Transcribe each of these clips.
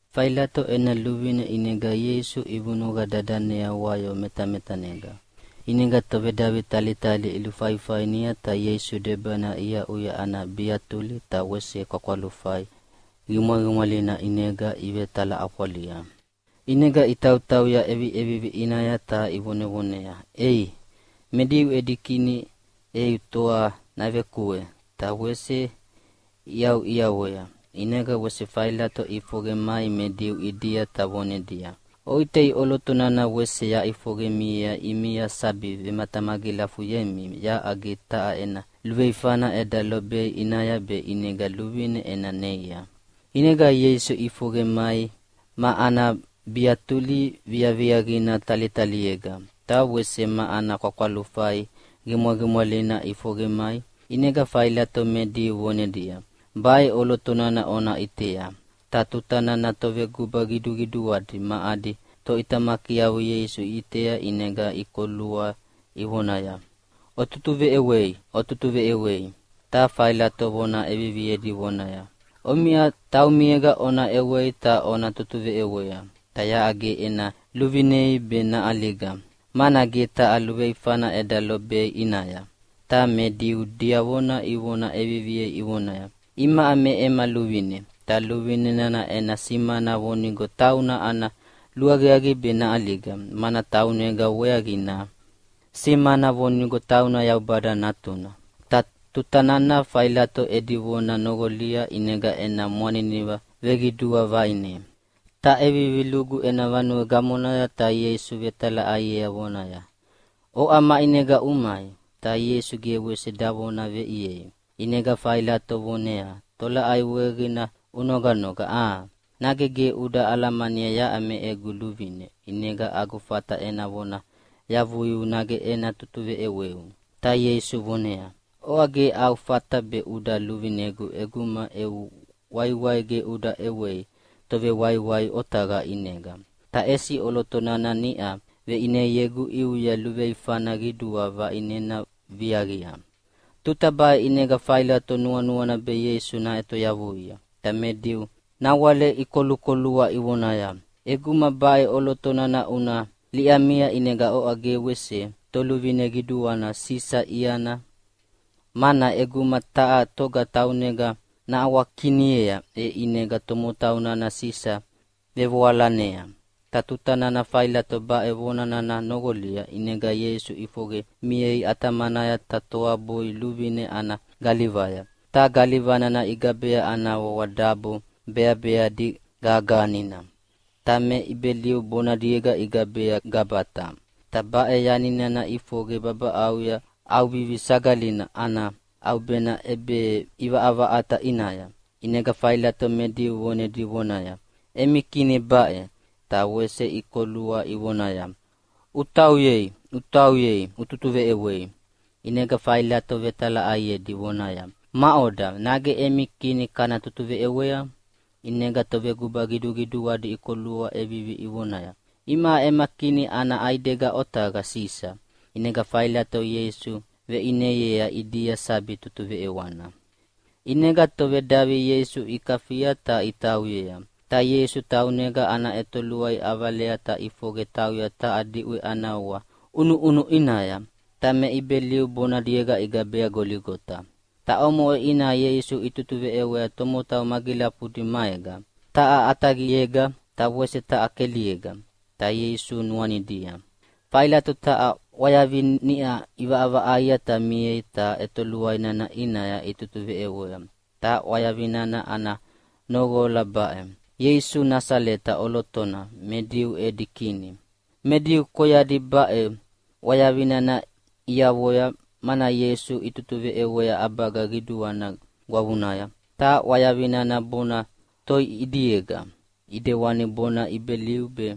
Failato ena luvine ʼinega Ieisu ivunuqa dadanea wayo metametanega. ʼInega tovedavi talitali ilufaifainia ta Ieisu debanaya iaʼuya ana biatuli. Ta wese kwakwalufai qimwaqimwalina ʼinega ivetalaʼafwalia, ʼinega itautauya ʼeviʼevivi ʼinaya ta ivonevoneaya, “Ei, me Diu edi Kini eu toa navekue!” Ta wese iʼauʼiawea. ʼInega wese Failato ʼifoqe mai me Diu ʼidia ta vonedia, “Oʼitei, ʼoloto nana wese yaʼifoqe miea ʼimia sabi vematamagilafuyemi yaʼa ge taha ena luveifana eda lobei ʼinaya be ʼinega luvine ena neia.” ʼInega Ieisu ʼifoqe mai ma ana biatuli viaviaqina talitaliega, ta wese ma ana kwakwalufai qimwaqimwalina ʼifoqe mai, ʼinega Failato me Diu vonedia, “Baʼe ʼoloto nana ona ʼitea!” Ta tuta nana toveguba qiduqiduadi ma adi toʼitamakiavo Ieisu iʼitea ʼinega ikolua ivonaya, “Ututuveʼewei, ututuveʼewei!” Ta Failato vona ʼeviviedi vonaya, “Omiʼa taumiega ona ʼewei ta ona tutuveʼewea, ta yaʼa ge ena luvinei be naʼaliga, mana ge taha luveifana eda lobei ʼinaya.” Ta me Diu diavona ivona ʼeviviea ivonaya, “Imaʼa me ema luvine, ta luvine nana ena simana vonigo tauna ana luaqiaqi be naʼaliga, mana taunega weaqina simana vonigo tauna Yaubada Natuna.” Ta tuta nana Failato edi vona noqolia ʼinega ena mwaniniva veqidua vaʼine, ta ʼevivi lugu ena vanue gamonaya ta Ieisu vetalaʼaiea vonaya, “Oʼa maʼinega umai?”, ta Ieisu ge wese davona veʼiei. ʼInega Failato voneaya, “Tolaʼai weaqina unoganoga, a? Nage ge uda alamania yaʼa me egu luvine, ʼinega agu fata ena vona yavuiu nage ena tutuveʼeweu?” Ta Ieisu voneaya, “Oʼa ge au fata be uda luvinegu ʼeguma eu waiwai ge uda ʼewei Tovewaiwai otaqa ʼinega. Ta ʼesi ʼoloto nana niʼa veʼineiegu ʼiuya luveifana qidua vaʼinena viaqia.” Tuta baʼe ʼinega Failato nuanuana be Ieisu naʼetoyavuia, ta me Diu nawale ikolukolua ivonaya, “ʼEguma baʼe ʼoloto nana una liʼamia ʼinega oʼa ge wese toluvine qiduana Sisa iana, mana ʼeguma taha toga taunega naʼawakiniea, e ʼinega tomotau nana Sisa vevoalanea.” Ta tuta nana Failato baʼe vona nana noqolia ʼinega Ieisu ʼifoqe miea ʼatamanaya ta toabui luvine ana galivaya. Ta galiva nana igabea ana wawa “Dabo Beabeadi Gagahanina.” Ta me Ibeliu bonadiega igabea Gabata. Ta baʼe yani nana ʼifoqe babaʼauya ʼAuvivia Sagalina ana ʼaubena ʼebeʼivaʼavaʼata ʼinaya. ʼInega Failato me Diu vonedi vonaya, “Emi Kini baʼe!” Ta wese ikolua ivonaya, “Utauyei, utauyei, ututuveʼewei!” ʼInega Failato vetalaʼaiedi vonaya, “Maʼoda, nage emi Kini kana tutuveʼewea?” ʼInega toveguba qiduqiduadi ikolua ʼevivi ivonaya, “Imaʼa ema kini ana ʼaidega otaqa Sisa!” ʼInega Failato Ieisu veʼineiea ʼidia sabi tutuveʼewana. ʼInega tovedavi Ieisu ikafia ta itauyea. Ta Ieisu taunega ana ʼetoluai ʼavalea ta ʼifoqe tauya taha diʼwe ana wawa ʼUnuʼunu ʼinaya. Ta me Ibeliu bonadiega igabea Goligota. Ta omoʼe ʼinaya Ieisu itutuveʼewea tomotau magilafudi maega. Taha ʼataqiega, ta wese taha keliega, ta Ieisu nuanidia. Failato taha ʼwayavi niʼa ʼivaʼavaʼaia ta miea, ta ʼetoluai nana ʼinaya itutuveʼewea. Ta ʼwayavi nana ana noqola baʼe: Ieisu Nasaleta ʼolotona, me Diu edi Kini Me Diu koyadi baʼe ʼwayavi nana iavoya, mana Ieisu itutuveʼewea ʼabaga qiduana gwavunaya, ta ʼwayavi nana bona toi ʼidiega ʼidewani bona Ibeliu be,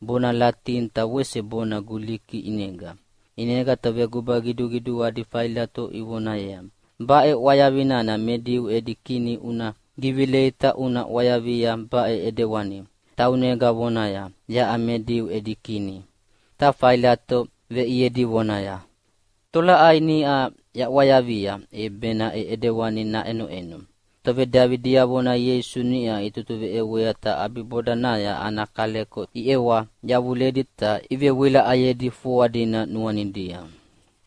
bona Latini ta wese bona Guliki ʼinega. ʼInega toveguba qiduqiduadi Failato ivoneaya, “Baʼe ʼwayavi nana ‘Me Diu edi Kini’ una givilei ta una ʼwayavia baʼe ʼidewani, ‘Taunega vonaya, yaʼa me Diu edi Kini.’” Ta Failato veʼiedi vonaya, “Tolaʼai niʼa yaʼwayavia, e benaʼe ʼidewani naʼenoʼeno.” Tovedavi diavona Ieisu niʼa itutuveʼewea ta ʼabibodanaya ana kaleko iʼewa yavuledi ta ivewilaʼayedi foa dina nuanidia.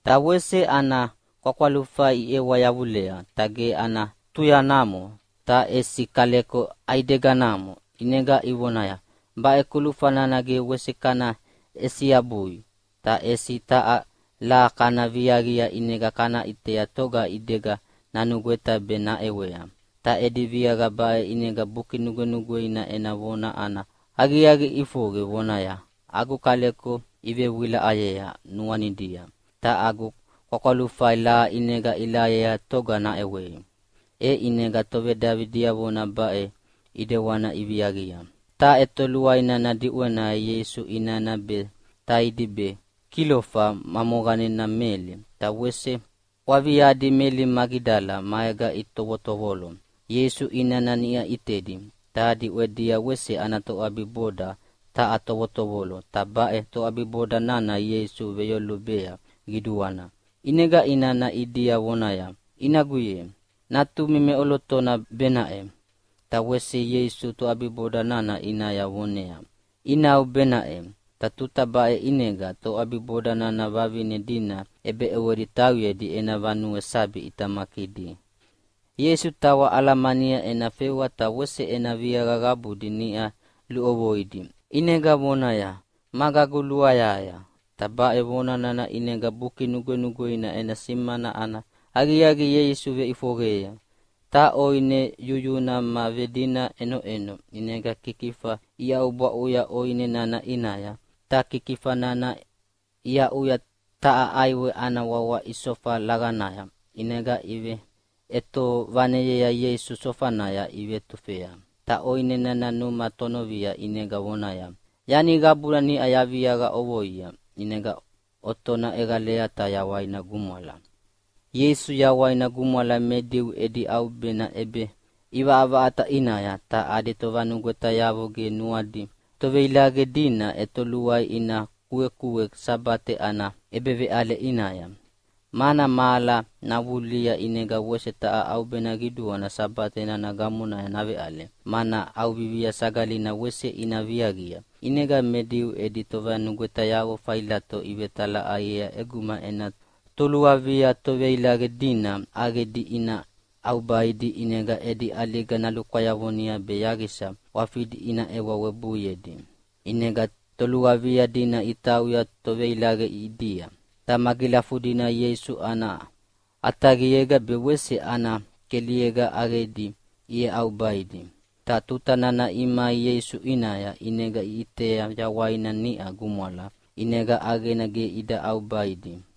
Ta wese ana kwakwalufai iʼewa yavulea, ta ge ana tuyanamo, ta ʼesi kaleko ʼaideganamo. ʼInega ivonaya, “Baʼe kulufa nana ge wese kana ʼesiabuabui, ta ʼesi taha laha kana viaqia ʼinega kana ʼitea toga ʼidega nanugweta be naʼewea.” Ta edi viaqa baʼe ʼinega Buki Nugwenugweina ena vona ana aqiaqi ʼifoqe, vonaya, “Agu kaleko ivewilaʼayea nuanidia ta agu kwakwalufai laha ʼinega ilahayea toga naʼewei.” E ʼinega tovedavi diavona baʼe ʼidewana iviaqia. Ta ʼetoluai nana diʼwenaya Ieisu inana be, taidi be, Kilofa moqanena Meli, ta wese waviadi Meli Magidala maega itovotovolo. Ieisu inana niʼa ʼitedi, ta diʼwedia wese ana toʼabiboda taha tovotovolo, ta baʼe toʼabiboda nana Ieisu veyolubea qiduana. ʼInega inana ʼidia vonaya, “Inagu ye, natumi meʼolotona benaʼe.” Ta wese Ieisu toʼabiboda nana ʼinaya voneaya, “Inau benaʼe.” Ta tuta baʼe ʼinega toʼabiboda nana vavine dina ʼebeʼewedi tauyedi ena vanuea sabi ʼitamakidi. Ieisu tawa alamania ena fewa ta wese ena viaqa qabudi niʼa luʼovoidi. ʼInega vonaya, “Magagu luayahaya.” Ta baʼe vona nana ʼinega Buki Nugwenugweina ena simana ana aqiaqi Ieisu veʼifoqeyea. Ta ʼoine yuyuna ma vedina ʼenoʼeno, ʼinega kikifa iʼaubwaʼuya ʼoine nana ʼinaya, ta kikifa nana iaʼuya taha ʼaiwe ana wawa isofa laqanaya, ʼinega iveʼetovaneyea Ieisu sofanaya ivetufea. Ta ʼoine nana numa tonovia ʼinega vonaya, “Yani qabuna niʼa yaviaqa ʼovoia.” ʼInega ʼotona ʼeqalea ta yawaina gumwala. Ieisu yawaina gumwala me Diu edi ʼaubena ʼebeʼivaʼavaʼata ʼinaya. Ta adi tovanugwetayavo ge nuanuadi toveilaqe dina ʼetoluaia ina kuekue Sabate ana ʼebeveʼale ʼinaya. Mana mahala navulihia ʼinega wese taha ʼaubena qiduana Sabate nana gamonaya naveʼale, mana ʼAuvivia Sagalina wese ina viaqia. ʼInega me Diu edi tovanugwetayavo Failato ivetalaʼaiea ʼeguma ena toluavia toveilaqe dina ʼaqedi ina ʼaubaidi ʼinega edi ʼaliga nalukwayavoni be yaqisa ʼwafidi ina ʼewa webuiedi. ʼInega toluavia dina itauya toveilaqe ʼidia, ta magilafudina Ieisu ana ʼataqiega be wese ana keliega ʼaqedi iʼeʼaubaidi. Ta tuta nana imai Ieisu ʼinaya, ʼinega iʼitea yawaina niʼa gumwala, ʼinega ʼaqena ge ida ʼaubaidi.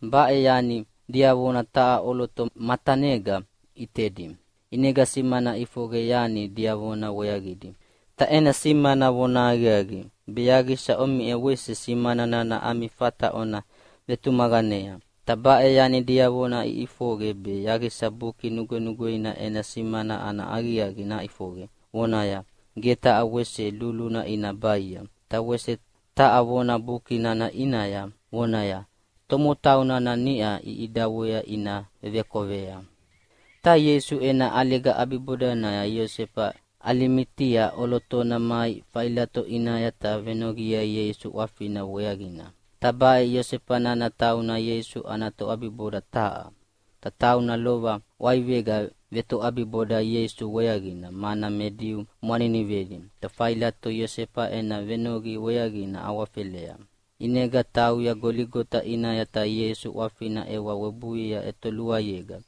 Baʼe yani diavona taha ʼoloto matanega ʼitedi, ʼinega simana ʼifoqe yani diavona weaqidi. Ta ena simana vonahaqiaqi, be yaqisa omiʼa wese simana nana ami fata ona vetumaqanea. Ta baʼe yani diavona iʼifoqe be yaqisa Buki Nugwenugweina ena simana ana aqiaqi naʼifoqe, vonaya, “Ge taha wese luluna ina baia.” Ta wese taha vona Buki nana ʼinaya vonaya, “Tomotau nana niʼa iʼidawea ina vevekovea.” Ta Ieisu ena ʼaliga ʼabibodanaya Iosefa Alimatia ʼolotona mai Failato ʼinaya ta venoqiea Ieisu ʼwafina weaqina. Ta baʼe Iosefa nana tauna Ieisu ana toʼabiboda taha. Ta tauna lova ʼwaivega vetoʼabiboda Ieisu weaqina, mana me Diu mwaninivedi. Ta Failato Iosefa ena venoqi weaqina awafela, ʼinega tauya Goligota ʼinaya ta Ieisu ʼwafina ʼewa webuiea ʼetoluaiega.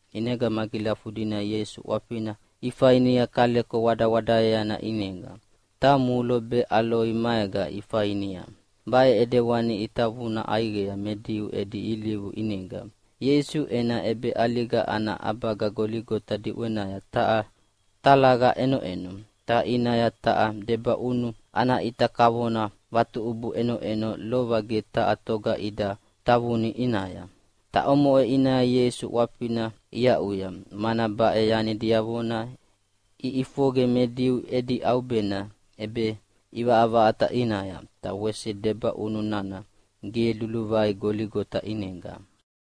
ʼInega magilafudina Ieisu ʼwafina ifainia kaleko wadawadaeana ʼinega, ta mulo be aloi maega ifainia. Baʼe ʼidewani itavuna ʼaiqea me Diu edi ilivu ʼinega. Ieisu ena ʼebeʼaliga ana ʼabaga Goligota diʼwenaya taha talaqa ʼenoʼeno, ta ʼinaya taha debaʼunu ana ʼita kavona vatuʼubu ʼenoʼeno, lova ge taha toga ida tavuni ʼinaya. Ta omoʼe ʼinaya Ieisu ʼwafina iaʼuya, mana baʼe yani diavona iʼifoqe me Diu edi ʼaubena ʼEbeʼivaʼavaʼata ʼinaya, ta wese debaʼunu nana ge luluvai Goligota ʼinega.